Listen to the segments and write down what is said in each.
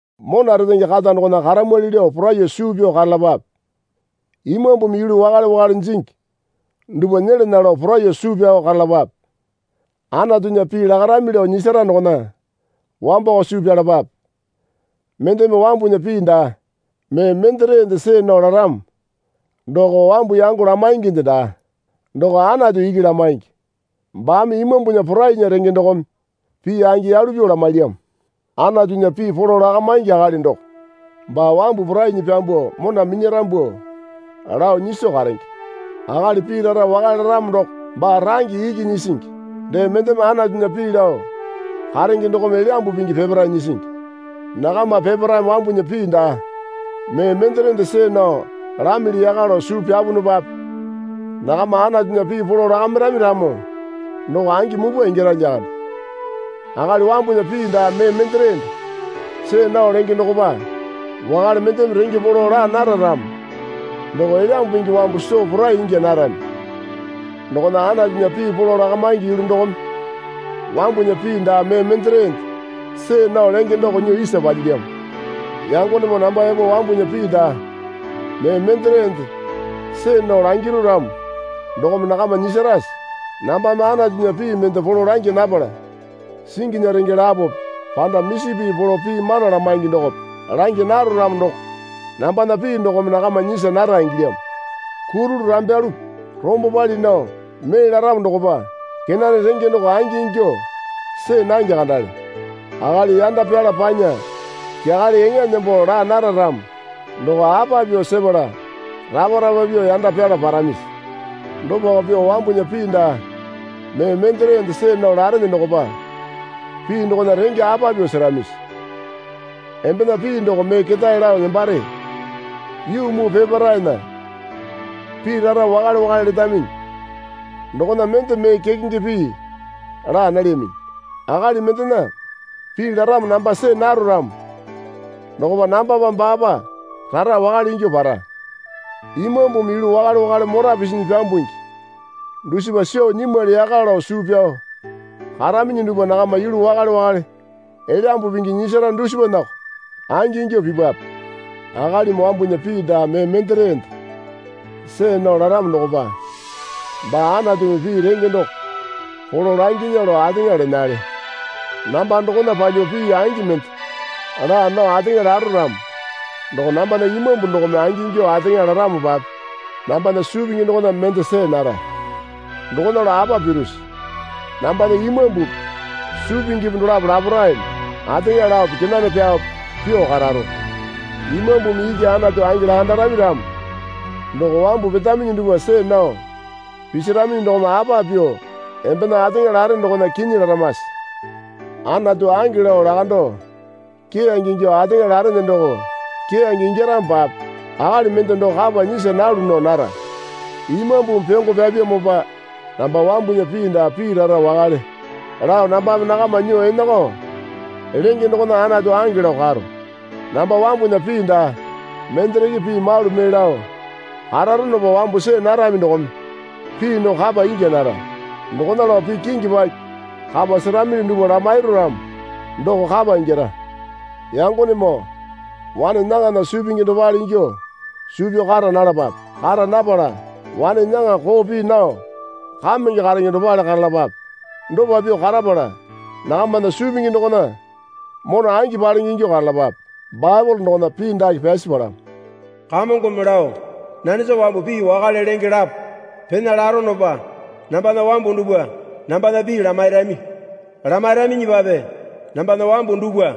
Mona retenge kata dokona karamwali lao poraiyuo suu pyao karalapape. Imambumi yulu wakale wakale jingi dupwa nyelana lao poraiyuo suu pyao karalapape. Anatunya pii lakarami lao nyisara dokona wambako suu pyalapape. Mendeme wambunya pii daa mee menderende see nao laramo doko wambu yango lamainginde daa. Doko Anatu iki lamaingi. Baame Imambunya porainya renge dokome pii angi yalu pyuo lamailyamo. Anatunya pii polo lakamaingi akali doko baa wambu porainyi pyambuo mona minyarambu lao nyiso karenge. Akali pii rara wakale laramo doko baa range iki nyisingi. Dee mendeme Anatunya pii lao karenge dokome Elyambu Pingi peparae nyisingi. Nakama peparaeme wambunya pii daa mee menderende see nao lamili yaka lao suu pyapunupape nakama Anatunya pii polo lakamairami ramo doko angi mupwa ingyara lyakande. Akali wambunya pii daa mee menderende see nao lenge dokopa wakale mendeme renge polo laa nara ramo doko Elyambu Pingi wambu soo porai ingya narami. Dokona Anatunya pii polo lakamaingi yulu dokome wambunya pii daa mee menderende see nao lenge doko nyuo isa palyilyamo. Yangonemoo namba epo wambunya pii daa mee menderende see nao langiru ramo dokome nakama nyisarase? Nambame Anatunya pii mende polo langya napala singinya renge lapope panda misi pii polo pii mana lamaingi dokope langya naro ramo doko nambana pii dokome nakama nyisa nara ingilyamo. Kurulu rambyalope rombo pali nao mee laramo dokopa kenane renge doko angi ingyuo see nange kandale. Akali yanda pyala panya kyakale eŋa nembo laa nara ramo doko apa pyuo sepala rapa rapa pyuo yanda pyala paramisi? Dopako pyuo wambunya pii daa mee menderende see nao larene dokopa pii dokona renge apa pyuo seramisi? Embena pii doko mee ketae lao nembare. Yuu muu peparaena pii rara wakale wakale letaminyi. Dokona mende mee kekenge pii laa nalyaminyi. Akali mendena pii laramo namba see naro ramo dokopa nambapa baapa rara wakale ingyuo para. Imambumi yulu wakale wakale mora pisinyi pyambungi dusipa soo nyimwali yaka lao suu pyao karaminyi dupwa nakama yulu wakale wakale Elyambu Pingi nyisara dusipanako angi ingyuo pipwape. Akalimi wambunya pii daa mee menderende see nao laramo dokopa baa Anatumi pii renge doko polo langinya lao ateŋa lenale. Namba dokona palyuo pii angi mende laa nao ateŋa laro ramo doko nambana imambu dokome angingyuo ateŋa laramopape nambana suu pingi dokona ende see nara. Dokona lao apa pirusi? Nambana imambupi suu pingipi dolapo laparaeme ateŋa laope kenane pyaope pyuo kararo. Imambumi iki Anatu angi lakandarami ramo doko wambu petaminyi dupwa see nao pisaraminyi dokome apa pyuo embena ateŋa lare dokona kinyi laramase? Anatu ange lao lakando keyange ingyuo ateŋa larene doko keyange ingyaramopape akali mende doko kapa nyisa nalu nao nara. Imambumi pyongo pyapyamopa namba wambunya pii daa pii rara wakale lao nambame nakama nyuo enako lenge dokona Anatu ange lao karo. Namba wambunya pii daa mendereke pii malu mee lao kararonopa wambu see narami dokome pii doko kapa ingya nara. Dokona lao pii kingi paki kapa seramili dupwa lamairu ramo doko kapa ingyara. Yangonemoo wane nyaŋana suu pingi dopale ingyuo suu pyao kara nalapape. Kara napala wane nyaŋa koo pii nao kamenge karenge dopale karalapape. Dopa pyuo karapala nakamana suu pingi dokona mona angi palenge ingyuo karalapape. Baepole dokona pii dake pyasi palamo. Kamongome lao, Nanesa wambu pii wakale lenge lapo pena laronopa nambana wambu dupwa nambana pii lamairami. Lamairaminyipape nambana wambu dupwa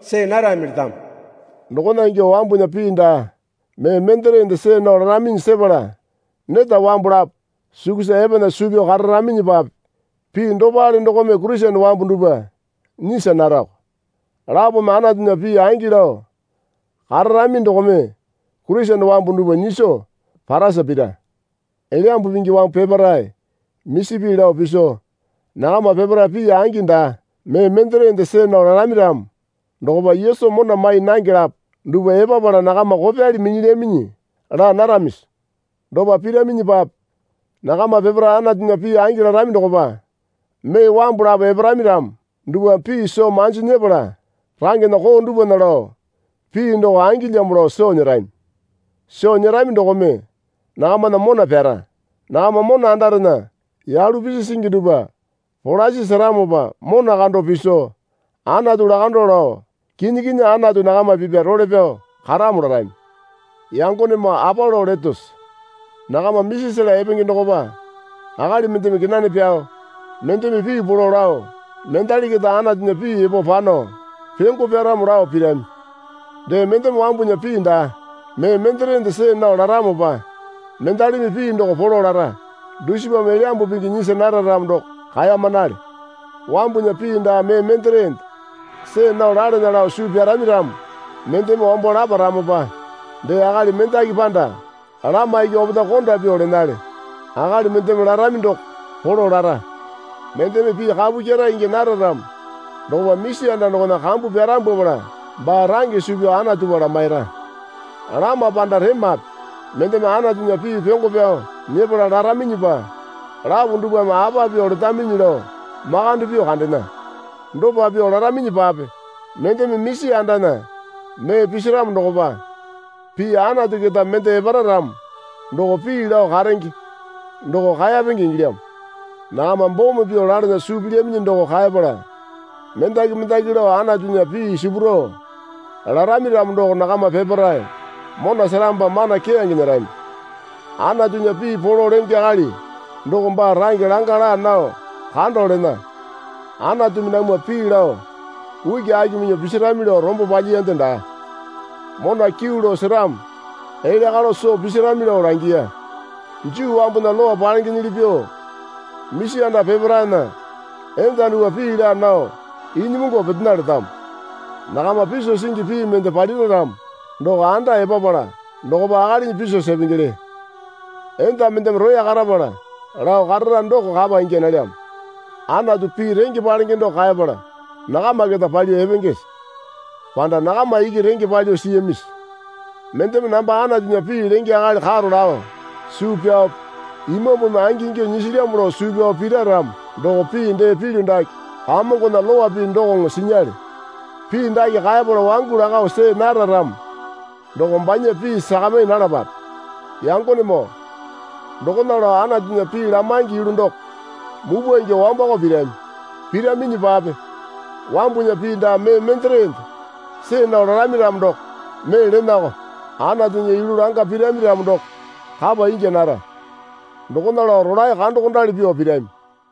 see narami letamo. Dokona ingyuo wambunya pii daa mee menderende see nao laraminyi sepala neta wambu lapo sukusa epana suu pyao kararaminyipape pii dopale dokome Kurisene wambu dupwa nyisa narako. Lapome Anatunya pii angi lao kararami dokome Kurisene wambu dupwa nyiso parasa pira. Elyambu Pingi wambu peparae misi pii lao piso nakama peparae pii angi daa mee menderende see nao larami ramo dokopa Yesu mona mai nange lapo dupwa epapala nakama kopyali minyilyaminyi laa naramisi? Dopa piraminyipape nakama peparae Anatunya pii angi larami dokopa mee wambu lapo eparami ramo dupwame pii soo manji nyepala rangena koo dupwana lao pii doko angilyamo lao soo nyerami. Soo nyerami dokome nakamana mona pyara. Nakama mona andarena yalu pisi singi dupwa polasi seramopa mona kando piso Anatu lakando lao, Kinyi kinyi Anatu nakama pipya role pyao karamo larami. Yangonemoo apa lao letose? Nakama misi sela epenge dokopa akali mendeme kenane pyao mendeme pii polo lao mendali keta Anatunya pii epo pano pyongo pyaramo lao pirami. Dee mendeme wambunya pii daa mee menderende see nao laramopa mendalimi pii doko polo lara. Dusipame Elyambu Pingi nyisa nara ramo doko kaemanale. Wambunya pii daa mee menderende see nao lalana lao suu pyarami ramo mendeme wambo laparamopa dee akali mendaki panda lama iki opetae konda pyuo lenale. Akali mendeme larami doko polo lara. Mendeme pii kapu kyera ingya nara ramo dokopa misi anda dokona kambu pyarambwapala baa range suu pyao Anatupa lamaira. Lama panda remape mendeme Anatunya pii pyongo pyao nyepala laraminyipa lapo dupwame apa pyuo letaminyi lao makande pyuo kandena. Dopa pyuo laraminyipape mendeme misi andana mee pisiramo dokopa pii Anatu keta mende epara ramo doko pii lao karenge doko kaeyapenge ingilyamo. Nakama bome pyuo lalana suu pilyaminyi doko kaepala mendaki mendaki lao Anatunya pii sipurao larami ramo doko nakama peparae mona seramopa mana keyange nyerami. Anatunya pii polo lenge akali doko baa range langa laa nao kando lena. Anatumi namwa pii lao ukiaki minyuo pisirami lao rombo palyiyande daa. Mona kyuu lao seramo elya kalo soo pisirami lao langiya. Juu wambunya Lowa palengenyili pyuo misi anda peparaena enda dupwa pii laa nao inyimungu petena letamo. Nakama piso singi pii mende palira ramo doko anda epapala dokopa akalinyi piso sepengele. Enda mendeme roya karapala lao karara doko kapa ingya nalyamo. Anatu pii renge palenge doko kaepala nakama keta palyuo epengese? Panda nakama iki renge palyuo siyamisi? Mendeme namba Anatunya pii lenge akali karo lao suu pyaope Imambumi angingyuo nyisilyamo lao suu pyaope pira ramo doko pii dee pilyu dake Kamongona lowa pii dokoŋo sinyale. Pii dake kaepala wangu lako see nara ramo doko banya pii sakami nalapape. Yangonemoo dokona lao Anatunya pii lamaingi yulu doko mupwa ingyuo wambako pirami. Piraminyipape wambunya pii daa mee menderende see nao larami ramo doko mee lenako. Anatunya yulu langa pirami ramo doko kapa ingya nara. Dokona lao rolae kandokondali pyuo pirami.